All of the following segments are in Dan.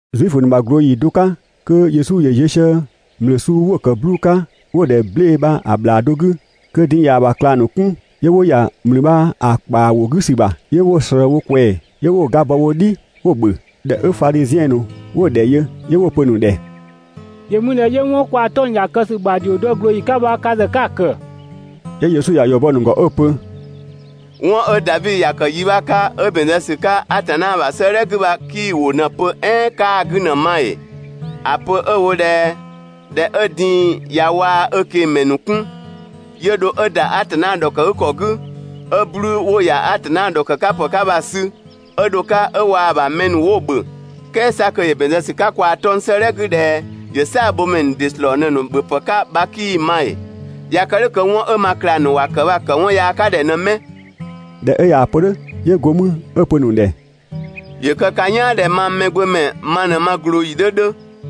Zuifö ‑nu ‑bha ꞊glooyi do 'ka kö Yesu ‑yö ziö sië ‑mlü suu 'wo‑ ‑kë 'bluu‑ 'ka 'wo‑ ‑dhɛ 'ble‑ bha‑ ‑bhlaa do 'gü, kö din‑ ꞊yaa‑ ‑bha ꞊klang ‑nu 'kun, 'yö 'wo ‑ya ‑mlü bha‑ ‑kpaa ‑wo 'gü ‑sü ‑bha, 'yö 'wo‑ ꞊slëë wo ꞊kwɛɛ‑ 'yö 'wo‑ ga bɔ wo "dhi 'wo‑ ‑bhö. ꞊Dhɛ 'ö Fadhiziɛn ‑nu 'wo‑ ‑dhɛ yö 'yö 'wo‑ pö‑ ‑nu ‑dhɛ: «‑Yö mü ꞊dhɛ 'yö 'wɔn 'ö kwaa‑ 'tɔng‑ ‑ya kë ‑sü ‑bha ‑dhio dɔ ꞊glooyi 'ka bha ka ‑zë 'ka‑ ‑kë?» 'Yö Yesu ‑ya ‑yɔ bɔ‑ ‑nu ‑gɔ 'ö‑ pö: «'Wɔn 'ö Davi ‑ya kë yi 'bha 'ka 'ö ‑bɛn zë ‑sü 'ka Atanna ‑bha 'sëëdhɛ 'gü bha 'kii‑ ‑wʋ ꞊në‑ pö "ɛɛn 'kaa‑ 'gü ꞊në‑ ma ‑ee? (‑A pö 'ö‑ wo ꞊dhɛ) ꞊dhɛ 'ö din‑ ꞊ya waa‑ ö ꞊kengmɛ ‑nu 'kun, ‑yö ‑dho 'ö ‑da Atanna ‑dhɔkëgükɔ 'gü, 'ö 'bluu‑ 'wo‑ ‑ya Atanna ‑dhɔkë 'ka ‑pë 'ka bha‑ sü 'ö dho‑ 'ka 'ö waa‑ ‑bha mɛ ‑nu 'wo‑ ‑bhö, "kɛɛ 'sa kö ‑yö ‑bɛn zë ‑sü 'ka kwaa‑ 'tɔng‑ 'gü ꞊dhɛ ‑yö "saabhomɛ ‑nu ‑dɩ ‑slɔɔ ꞊në‑ ‑nu ‑bhöpë 'ka bha 'kii‑ ma ‑ee? ꞊Ya kë "dhʋ̈ kö 'wɔn 'ö ma ꞊klang ‑nu ‑wa ‑kë bha‑ ‑kë 'wɔn yaa 'ka ‑dhɛ ꞊në 'mɛ?» ꞊Dhɛ 'ö ꞊yaa‑ pö "dhʋ̈, 'yö 'go mü 'ö‑ pö‑ ‑nu ‑dhɛ: «‑Yö kë ka "yaan ꞊dhɛ mang Mɛgbömɛ ma ꞊në ma ꞊glooyi 'dhö 'dhö.»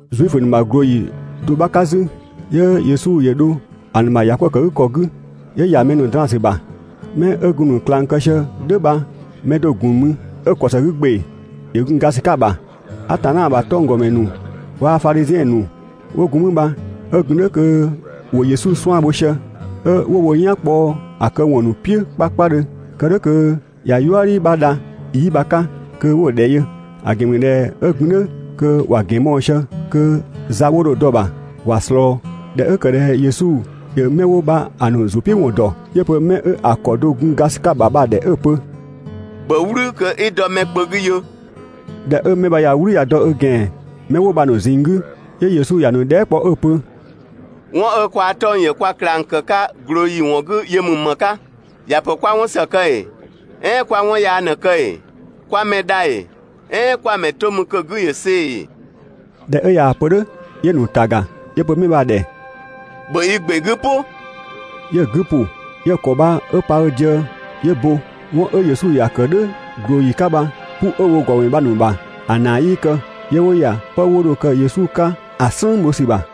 Zuifö ‑nu ‑bha ꞊glooyi do 'bha 'ka 'zü, 'yö Yesu ‑yö dho ‑a ‑nu bha ‑yakwëëkëgükɔ 'gü 'yö ‑ya mɛ draan‑ ‑sü ‑bha. 'Mɛ 'ö gun‑ ‑nu ꞊klang kë sië "dhʋ̈ bha mɛ do‑ ‑gun mü 'ö‑ ‑kɔ ‑së 'gü ‑gbe ‑yö gun ga ‑sü 'ka‑ ‑bha. Atanna ‑bha 'tɔnggɔmɛ ‑nu waa‑ Fadhiziɛn ‑nu 'wo gun mü bha 'ö gun "dhʋ̈ kö wo Yesu 'suan‑ bho sië, 'ö 'wo wo "yan kpɔ‑ këwɔn ‑nu "piʋ̈ 'kpakpadhö, kë "dhʋ̈ kö ꞊ya "yuëdhi 'bha dha 'yi bha‑ 'ka kö 'wo‑ ‑dhɛ yö; ‑a ‑gɛn ‑mü ꞊dhɛ 'ö gun "dhʋ̈ kö ‑wa ‑gɛn mɔɔ‑ sië kö za 'wo dho‑ dɔ‑ ‑bha ‑wa ꞊slɔɔ. ꞊Dhɛ 'ö ‑kë ꞊dhɛ Yesu ‑yö 'mɛ 'wo bha‑ ‑nu ‑zʋ "piʋ̈ ‑wɔn ‑dɔ, 'yö‑ pö 'mɛ 'ö‑ ‑kɔ do‑ gun ga ‑sü 'ka‑ ‑bha bha‑ ‑dhɛ 'ö‑ pö: «‑Bhö "wlü kö 'i dɔ mɛ kpö 'gü yö!» ꞊Dhɛ 'ö 'mɛ bha ꞊ya "wlü ꞊ya dɔ ö ‑gɛan 'mɛ 'wo bha‑ ‑nu ꞊zinng 'gü, 'yö Yesu ‑ya ‑nu dhɛɛ" kpɔ 'ö‑ pö: «'Wɔn 'ö kwaa‑ 'tɔng‑ ‑yö kwa ꞊klang ‑kë 'ka ꞊glooyi ‑wɔn 'gü yö ‑mü ‑më 'ka? ‑Ya ‑pö 'kwa 'wɔn ‑së kë ‑ee? "Ɛɛn 'kwa 'wɔn yaa ꞊në‑ kë ‑ee, 'kwa mɛ dha ‑ee, "ɛɛn 'kwa‑ ‑mɛ to mü kö‑ 'gü ‑yö see‑ ‑ee?» ꞊Dhɛ 'ö ꞊yaa‑ pö "dhʋ̈, 'yö‑ ‑nu ‑ta ‑ga, 'yö‑ pö 'mɛ bha‑ ‑dhɛ: «‑Bhö i ‑gbe 'gü "pʋ!» 'Yö‑ 'gü ‑pʋ, 'yö‑ ‑kɔ bha 'ö pa ö diëë, 'yö bo. 'Wɔn 'ö Yesu ‑ya ‑kë "dhʋ̈ ꞊glooyi 'ka bha, 'pu 'ö‑ wo ‑gɔmɛ ‑nu bha‑ ‑nu ‑bha, ‑a ‑naa 'yii kë, 'yö 'wo ‑ya 'pë 'wo dho‑ kë Yesu 'ka ‑a "slën bho ‑sü ‑bha.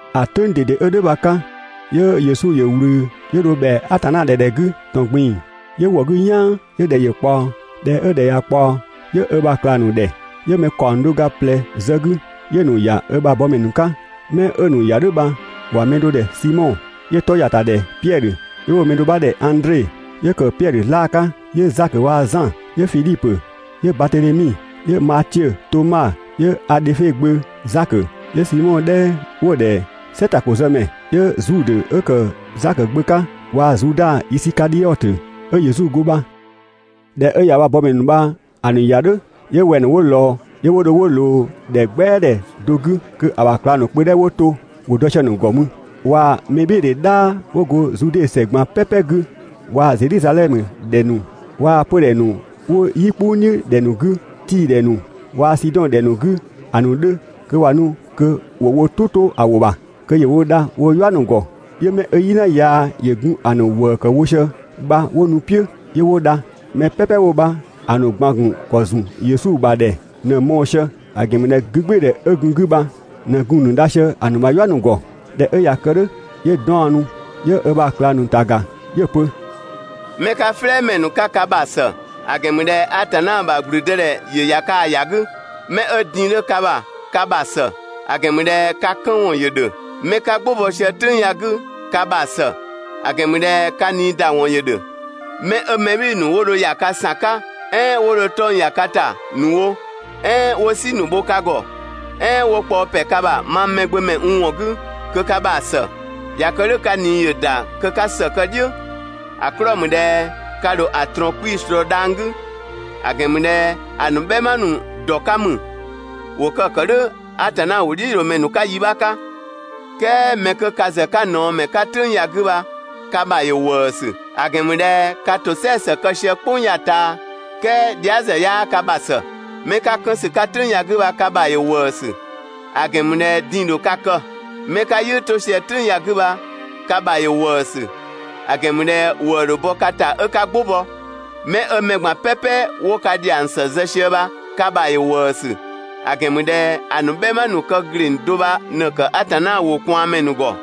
‑A "tʋ̈ng ꞊dede 'ö "dhʋ̈ bha‑ 'ka, 'yö Yesu ‑yö ꞊wlü 'yö dho ‑bhɛa Atanna ‑dhɛ ‑dhɛ 'gü ‑tɔn ꞊gbin‑, 'yö ‑wɔ 'gü "yaan 'yö ‑dhɛ ‑yö ꞊kpaɔ. ꞊Dhɛ 'ö ‑dhɛ ꞊ya ꞊kpaɔ, 'yö ö ‑bha ꞊klang ‑nu ‑dhɛ, 'yö‑ mɛ ‑kaɔng do ga ꞊plɛ zë‑ 'gü, 'yö‑ ‑nu ‑ya ö ‑bha bɔmɛ ‑nu 'ka. 'Mɛ 'ö‑ ‑nu ‑ya "dhʋ̈ bha ‑wa mɛ do ‑dhɛ Simɔ, 'yö‑ 'tɔ ‑ya ‑ta ‑dhɛ Piɛdhö. 'Yö 'wo‑ mɛ do 'bha ‑dhɛ Andre, 'yö ‑kë Piɛdhö 'zlaa‑ 'ka, 'yö Zakö waa‑ Zan, 'yö Fidhipö, 'yö Batedhemi, 'yö Matiö, Toma, 'yö Adhöfe gbö Zakö, 'yö Simɔ 'dhɛ 'wo‑ ‑dhɛ «"sɛtakozëmɛ» 'yö Zudë 'ö ‑kë Zakö gbö 'ka waa‑ Zuda Isikadhiɔtö 'ö Yesu go bha. ꞊Dhɛ 'ö ꞊ya ö ‑bha bɔmɛ ‑nu bha‑ ‑nu ‑ya "dhʋ̈, 'yö wɛng‑ ‑nu 'wo ꞊lɔɔ, 'yö 'wo dho 'wo ꞊loo ‑dhɛ "gbɛa ‑dhɛ do 'gü, kö‑ ‑bha ꞊klang ‑nu kpö 'dhɛ 'wo to ‑wo dɔ sië‑ ‑gɔ mü, waa‑ mɛbhɩɩdhe "dhaa 'wo go Zude ‑sɛ ꞊gban "pɛpɛ 'gü waa‑ Zedhizadhɛmö ‑dhɛ ‑nu waa‑ 'pödhɛ ‑nu 'wo "yi "kpʋng "dhiʋ̈ ‑dhɛ ‑nu 'gü, Tii‑ ‑dhɛ ‑nu waa‑ Sidɔn ‑dhɛ ‑nu 'gü ‑a ‑nu 'dhö, kö ꞊wa nu kö ‑wo wo "tʋ 'to‑ ‑wʋ ‑bha, kö ‑yö wo dha woo‑ "yua ‑nu ‑gɔ. 'Yö 'mɛ 'ö "yina yaa ‑yö gun‑ ‑nu ‑wëë ‑kë wo sië bha 'wo nu‑ "piʋ̈, 'yö 'wo dha. Mɛ "pɛpɛ 'wo bha‑ ‑nu ꞊gban‑ ‑gun ‑kɔ ‑zun Yesu bha ‑dhɛ ꞊në‑ mɔɔ‑ sië, ‑a ‑gɛn ‑mü ꞊dhɛ 'gügbɩɩdhɛ 'ö gun‑ 'gü bha ꞊në gun‑ ‑nu dha sië‑ ‑nu ‑bha "yua ‑nu ‑gɔ. ꞊Dhɛ 'ö ꞊ya kë "dhʋ̈, 'yö 'daɔnnu 'yö ö ‑bha ꞊klang ‑nu ‑ta ‑ga 'yö‑ pö: «'Mɛ 'ka "flɛɛmɛ ‑nu 'ka ka ‑bha ‑së; ‑a ‑gɛn ‑mü ꞊dhɛ Atanna ‑bha ‑gblüdëdhɛ ‑yö ‑ya kaa‑ ‑ya 'gü. 'Mɛ 'ö din‑ 'dhö ka ‑bha ka ‑bha ‑së; ‑a ‑gɛn ‑mü ꞊dhɛ ka 'kën ‑wɔn ‑yö ‑dhö! 'Mɛ 'ka "gbʋ bɔ sië "tʋ̈ng ya‑ 'gü ka ‑bha ‑së; ‑a ‑gɛn ‑mü ꞊dhɛ ka ꞊niida ‑wɔn ‑yö ‑dhö! 'Mɛ 'ö mɛ "bhɩɩ‑ ‑nu 'wo dho ‑ya ka ‑san 'ka "ɛɛn 'wo dho 'tɔng ‑ya ka ‑ta ‑nu wo, "ɛɛn 'wo "si ‑nu bho ka ‑gɔ, "ɛɛn 'wo kpaɔ ‑pɛ ka ‑bha mang Mɛgbömɛ n ‑wɔn 'gü, kö ka ‑bha ‑së. ꞊Ya kë "dhʋ̈ ka ꞊nii ‑yö ‑da kö 'ka ‑së kë‑ "dhiʋ̈, ‑a 'klɔɔ‑ ‑mü ꞊dhɛ ka ‑dho ‑a ꞊trɔɔn 'kpii‑ ꞊slɔɔ dhang‑ 'gü; ‑a ‑gɛn ‑mü ꞊dhɛ ‑a ‑nu "bhɛma ‑nu ‑dɔ 'ka ‑mü, ‑wo kë ‑kë "dhʋ̈ Atanna ‑wʋdhiʋ̈loomɛ ‑nu 'ka yi 'bha 'ka. "Kɛɛ 'mɛ 'kö ka ‑zë 'ka ꞊naɔmɛ ‑nu 'ka "tʋ̈ng ya‑ 'gü bha ka ‑bha ‑yö ‑wëësü; ‑a ‑gɛn ‑mü ꞊dhɛ ka ‑bha ꞊në 'ka‑ kë sië bha ("kɛɛ dhia" ‑zë 'yaa ka ‑bha ‑së!) 'Mɛ 'ka 'kënsü 'ka "tʋ̈ng ya‑ 'gü bha ka ‑bha ‑yö ‑wëësü; ‑a ‑gɛn ‑mü ꞊dhɛ din‑ ‑dho ka kë. 'Mɛ 'ka "yɩɩ 'to sië "tʋ̈ng ya‑ 'gü bha, ka ‑bha ‑yö ‑wëësü; ‑a ‑gɛn ‑mü ꞊dhɛ ‑wëë ‑dho bɔ ka ‑ta 'ö 'ka "gbʋ bɔ! 'Mɛ 'ö mɛ ꞊gban "pɛpɛ 'wo ka ‑dhiang ‑së zë sië bha, ka ‑bha ‑yö ‑wëësü, ‑a ‑gɛn ‑mü ꞊dhɛ ‑a ‑nu "bhɛma ‑nu kë ‑gleng do bha ꞊në‑ ‑kë Atanna ‑wʋ ꞊kwaanmɛ ‑nu ‑gɔ.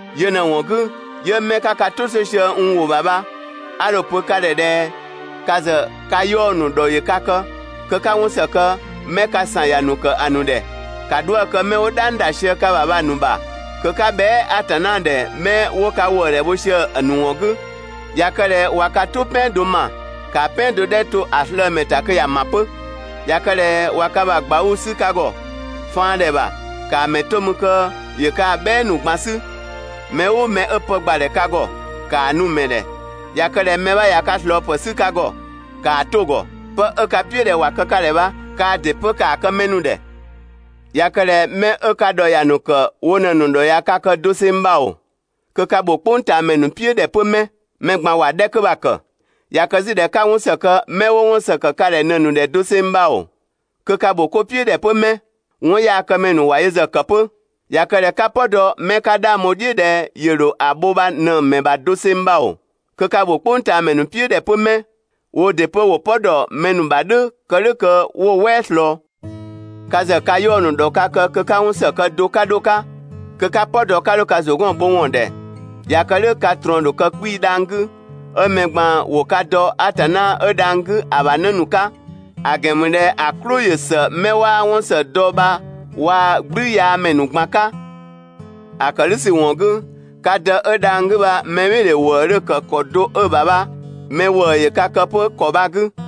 Yö ꞊në‑ ‑wɔn 'gü, 'yö 'mɛ 'ka ka "tʋ 'to sië n ‑wʋ ‑bha bha, 'a dho‑ pö ka ‑dhɛ ꞊dhɛ ka ‑zë ka 'yaɔ‑ ‑nu ‑dhɔ ‑yö ka kë, kö 'ka 'wɔn ‑së kë 'mɛ ka ‑san ‑ya ‑nu ‑kë ‑a ‑nu ‑dhɛ. ‑Ka 'dhuë‑ kë 'mɛ 'wo "dhang ‑da sië ka ‑bha bha‑ ‑nu ‑bha, kö 'ka bhɛa" Atanna ‑dhɛ 'mɛ 'wo ka ‑wëëdhɛ bho sië‑ ‑nu ‑wɔn 'gü. ꞊Ya kë ꞊dhɛ ꞊wa ka "tʋ "pɛan do ‑ma, ‑kaa "pɛan do 'dhɛ 'ö to‑ slëë‑ ‑mɛ ‑ta kö ‑ya ‑ma 'pö. ꞊Ya kë ꞊dhɛ ꞊wa ka ‑bha ꞊gbauu‑ 'sü ka ‑gɔ (faandhɛ ‑bha), ‑kaa ‑mɛ 'to mü kö ‑yö kaa‑ "bhɛɛ ‑nu ꞊gban 'sü. Mɛ "ʋʋ mɛ 'ö pë ‑gbadhɛ ka ‑gɔ, ‑kaa nu‑ ‑mɛ ‑dhɛ. ꞊Ya kë ꞊dhɛ mɛ 'bha ꞊ya ka ꞊slɔɔpë 'sü ka ‑gɔ, ‑kaa 'to‑ ‑gɔ. 'Pë 'ö 'ka‑ "piʋ̈ ꞊dhɛ ‑wa kë ka ‑dhɛ bha kaa ‑dɩ 'pö ‑kaa kë mɛ ‑nu ‑dhɛ. ꞊Ya kë ꞊dhɛ 'mɛ 'ö ka ‑dhɔ ‑ya ‑nu ‑kë wo ꞊në‑ ‑nu ‑dhɔ ꞊ya ka kë doseng bha ‑oo, kö ka ‑bho "kpʋngtaamɛ ‑nu "piʋ̈ ‑dhɛ 'pö 'mɛ? Mɛ ꞊gban ‑wa 'dhɛ 'kö bha‑ ‑kë! ꞊Ya kë 'zü ꞊dhɛ 'ka 'wɔn ‑së kë 'mɛ 'wo 'wɔn ‑së ‑kë ka ‑dhɛ ꞊në‑ ‑nu ‑dhɛ doseng bha ‑oo, kö ka ‑bho 'ko "piʋ̈ ‑dhɛ 'pö 'mɛ? 'Wɔnyaakëmɛ ‑nu ‑wa yö ‑zë ‑kë 'pö! ꞊Ya kë ꞊dhɛ 'ka "pɔ dɔ 'mɛ 'ka 'dhang bho‑ "dhiʋ̈ ꞊dhɛ ‑yö ‑dho ‑a bho bha ꞊në‑ ‑mɛ ‑bha doseng bha ‑oo, kö ka ‑bho "kpʋngtaamɛ ‑nu "piʋ̈ ‑dhɛ 'pö 'mɛ? Woo ‑dɩ 'pö ‑wo "pɔ ‑dɔ mɛ ‑nu ‑bha "dhʋ̈ kë "dhʋ̈ kö 'wo‑ "wɛɛ ꞊slɔɔ. Ka ‑zë ka 'yaɔ‑ ‑nu ‑dhɔ ka kë kö 'ka 'wɔn ‑së kë do 'ka 'dho‑ 'ka, kö 'ka "pɔ dɔ 'ka 'dho ka ‑zʋ 'gɔn‑ bho ‑wɔn ‑dhɛ. ꞊Ya kë "dhʋ̈ ka ꞊trɔɔn‑ ‑dho kë 'kpii‑ dhang‑ 'gü, 'ö mɛ ꞊gban 'wo ka dɔ Atanna 'ö dhang‑ 'gü ‑a ‑bha 'në ‑nu 'ka, ‑a ‑gɛn ‑mü ꞊dhɛ ‑a "klʋ ‑yö ‑së 'mɛ 'waa 'wɔn ‑së dɔ bha waa‑ "gblüyaamɛ ‑nu ꞊gban 'ka. ‑A ‑kë "dhʋ̈ ‑sü ‑wɔn 'gü, ka Dë 'ö dhang‑ 'gü bha mɛbhɩɩdhe ‑wëë 'dhö‑ kë ‑kɔ do 'ö‑ ‑bha bha mɛ ‑wëë ‑yö ka kë 'pö‑ ‑kɔ ‑bha.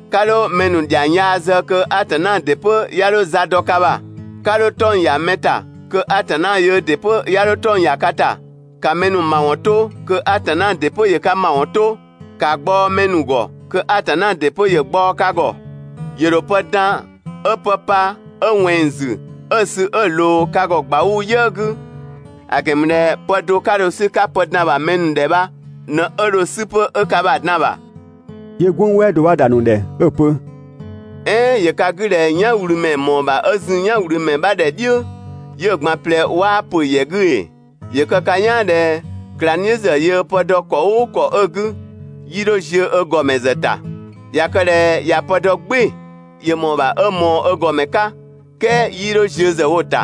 'Ka 'dho mɛ ‑nu ‑dhiang yaa zë kö Atanna ‑dɩ 'pö 'ya 'dho za dɔ ka ‑bha. 'Ka 'dho 'tɔng‑ ‑ya mɛ ‑ta kö Atanna yöö ‑dɩ 'pö 'ya 'dho 'tɔng‑ ‑ya ka ‑ta. ‑Ka mɛ ‑nu ‑mawɔn 'to kö Atanna ‑dɩ 'pö ‑yö ka ‑mawɔn 'to. ‑Ka gbaɔ‑ mɛ ‑nu ‑gɔ, kö Atanna ‑dɩ 'pö ‑yö gbaɔ‑ ka ‑gɔ. ‑Yö ‑dho pë dan 'ö pë pa 'ö ꞊wɛnng ‑zü 'ö‑ sü 'ö‑ ꞊loo ka ‑gɔ ꞊gbauu‑ "yië‑ 'gü; ‑a ‑gɛn ‑mü ꞊dhɛ pë do 'ka dho‑ 'sü 'ka pë dan‑ ‑bha mɛ ‑nu ‑dhɛ bha ꞊në 'ö dho‑ 'sü 'pö 'ö ka ‑bha dan‑ ‑bha.» 'Yö "gwënng "wɛɛ do 'bha ‑da ‑a ‑nu ‑dhɛ 'ö‑ pö: «"Ɛɛn ‑yö ka 'gü ꞊dhɛ "yanwlümɛ ‑mɔɔ ‑bha 'ö zun "yanwlümɛ 'bha ‑dhɛ "dhiʋ̈, 'yö‑ ꞊gban ꞊plɛ 'waa ‑pö ‑yɛ 'gü ‑ee? ‑Yö kë ka "yaan ꞊dhɛ ꞊klangdhiʋ̈ ‑zë yöö pë dɔ ‑kɔ "ʋʋ ‑kɔ 'ö‑ 'gü, 'yii 'dho ziö ö ‑gɔmɛ ‑zë ‑ta. ꞊Ya kë ꞊dhɛ ꞊ya pë dɔ "gbɩɩ‑, ‑yö ‑mɔɔ ‑bha 'ö ꞊mɔɔ ö ‑gɔmɛ 'ka, "kɛɛ 'yii 'dho ziö ‑zë wo‑ ‑ta.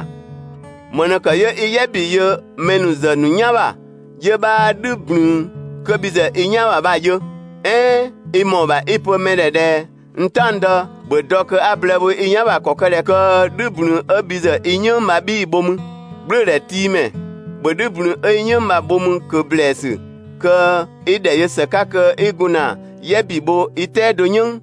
‑Më ꞊në ‑kë 'yö 'i "yɛ ‑bi yö mɛ ‑nu ‑zë ‑nu "yan ‑bha, 'yö 'bhaa "dhü ꞊blün 'kö bhi ‑zë i "yan ‑bha bha‑ yö? "Ɛɛn i ‑mɔɔ ‑bha 'i‑ pö mɛ ‑dhɛ ꞊dhɛ: «N "taɔngdë, ‑bhö dɔ kö 'a blëë bho i "yan ‑bha ‑kɔ kë ꞊dhɛ kö "dhü ꞊blün 'ö bhi ‑zë i "yënng bha 'bhii‑ bho mü. "Gblʋ̈ʋ̈dhɛtiimɛ, ‑bhö "dhü ꞊blün 'ö i "yënng bha‑ bho 'mü ꞊kö ‑blɛɛsü kö 'i ‑dhɛ yö ‑së 'ka kö 'i gun ‑na "yɛ ‑bi bho i "tɛado "yënng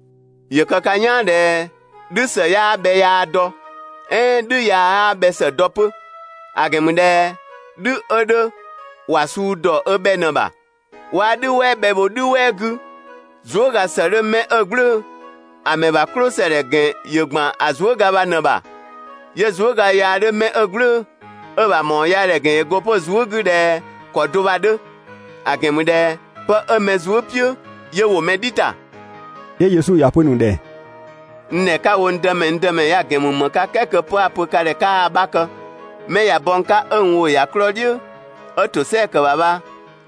‑Yö kë ka "yaan ꞊dhɛ "dhü ‑së 'yaa bhɛ yaa dɔ, "ɛɛn "dhü yaa 'yaa bhɛ ‑së dɔ 'pö; ‑a ‑gɛn ‑mü ꞊dhɛ "dhü 'ö 'dhö ‑wa suu ‑dɔ ö bhɛ ꞊në‑ ‑bha. 'Waa "dhü "wɛɛ bhɛ bho "dhü "wɛɛ 'gü. Zuëga ‑së 'dhö 'mɛ 'ö "gblʋ̈ʋ̈‑ ‑a ‑mɛ ‑bha "klʋsëdhɛ ‑gɛn ‑yö ‑gban ‑a zuëga bha ꞊në‑ ‑bha, 'yö zuëga yaa 'dhö mɛ 'ö "gblʋ̈ʋ̈‑ 'ö‑ ‑bha ‑mawɔnyaadhɛ ‑gɛn ‑yö go 'pö‑ zuë" 'gü ꞊dhɛ ‑kɔ do bha‑ 'dhö; ‑a ‑gɛn ‑mü ꞊dhɛ pë 'ö mɛ zuë" "piʋ̈ 'yö ‑wo mɛ "dhi ‑ta.» 'Yö Yesu ‑ya pö‑ ‑nu ‑dhɛ: «N ‑dhɛ 'ka‑ wo n Dëmɛ, n Dëmɛ ya‑ ‑gɛn ‑mü ‑më 'ka "kɛɛ kö 'pë 'a‑ pö ka ‑dhɛ 'kaa‑ 'bha kë? 'Mɛ ꞊ya bɔ n 'ka 'ö n ‑wʋ ‑ya 'klɔɔ‑ "dhiʋ̈, 'ö ‑tosɛa ‑kë ‑bha bha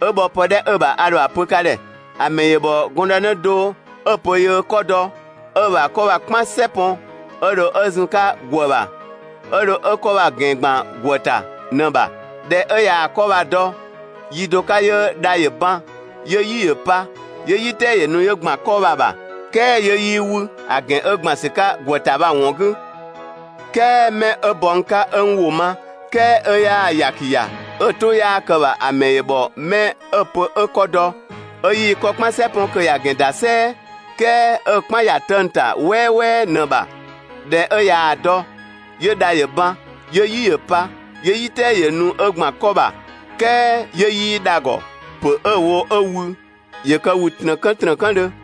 'ö bhɔ pë 'dhɛ 'ö‑ ‑bha a ‑dho ‑a pö ka ‑dhɛ. ‑A ‑mɛ ‑yö ‑bhɔ gɔndënë do 'ö‑ pö yöö 'kɔ dɔ, 'ö ö ‑bha 'kɔ bha‑ "kpan "sɛ pɔn 'ö dho 'ö zun‑ 'ka ‑gwë ‑bha, 'ö dho 'ö 'kɔ bha‑ ‑gɛn ‑gban ‑gwë ‑ta ꞊në‑ ‑bha. ꞊Dhɛ 'ö ꞊yaa‑ 'kɔ bha‑ dɔ, yi do 'ka 'yö dha ‑yö ban, 'yö "yi ‑yö pa, 'yö "yi "tɛɛ ‑yö nu ‑yö ‑gban 'kɔ bha‑ ‑bha, "kɛɛ 'yö 'yii 'wü, ‑a ‑gɛn 'ö ‑gban ‑sü 'ka ‑gwë ‑ta bha‑ ‑wɔn 'gü. "Kɛɛ mɛ 'ö bɔ n 'ka 'ö n ‑wʋ ma, "kɛɛ 'ö 'yaa‑ ‑yaki ‑ya, 'ö‑ "tʋ 'yaa kë‑ ‑bha ‑a ‑mɛ ‑yö ‑bhɔ 'mɛ 'ö‑ pö 'ö 'kɔ dɔ, 'ö 'yii 'kɔ "kpan "sɛ 'pɔn kö ‑ya ‑gɛn ‑da "sɛɛ, "kɛɛ 'ö‑ "kpan ‑ya 'tëng‑ ‑ta "wɛɛwɛɛ ꞊në‑ ‑bha. ꞊Dhɛ 'ö ꞊yaa‑ dɔ, 'yö dha ‑yö ban, 'yö "yi ‑yö pa, 'yö "yi "tɛɛ ‑yö nu 'ö ‑gban 'kɔ ‑bha. "Kɛɛ 'yö 'yii dha‑ ‑gɔ, ‑pö 'ö‑ wo 'ö wü, ‑yö kë ‑wü ‑trëkë ‑trëkëdhö.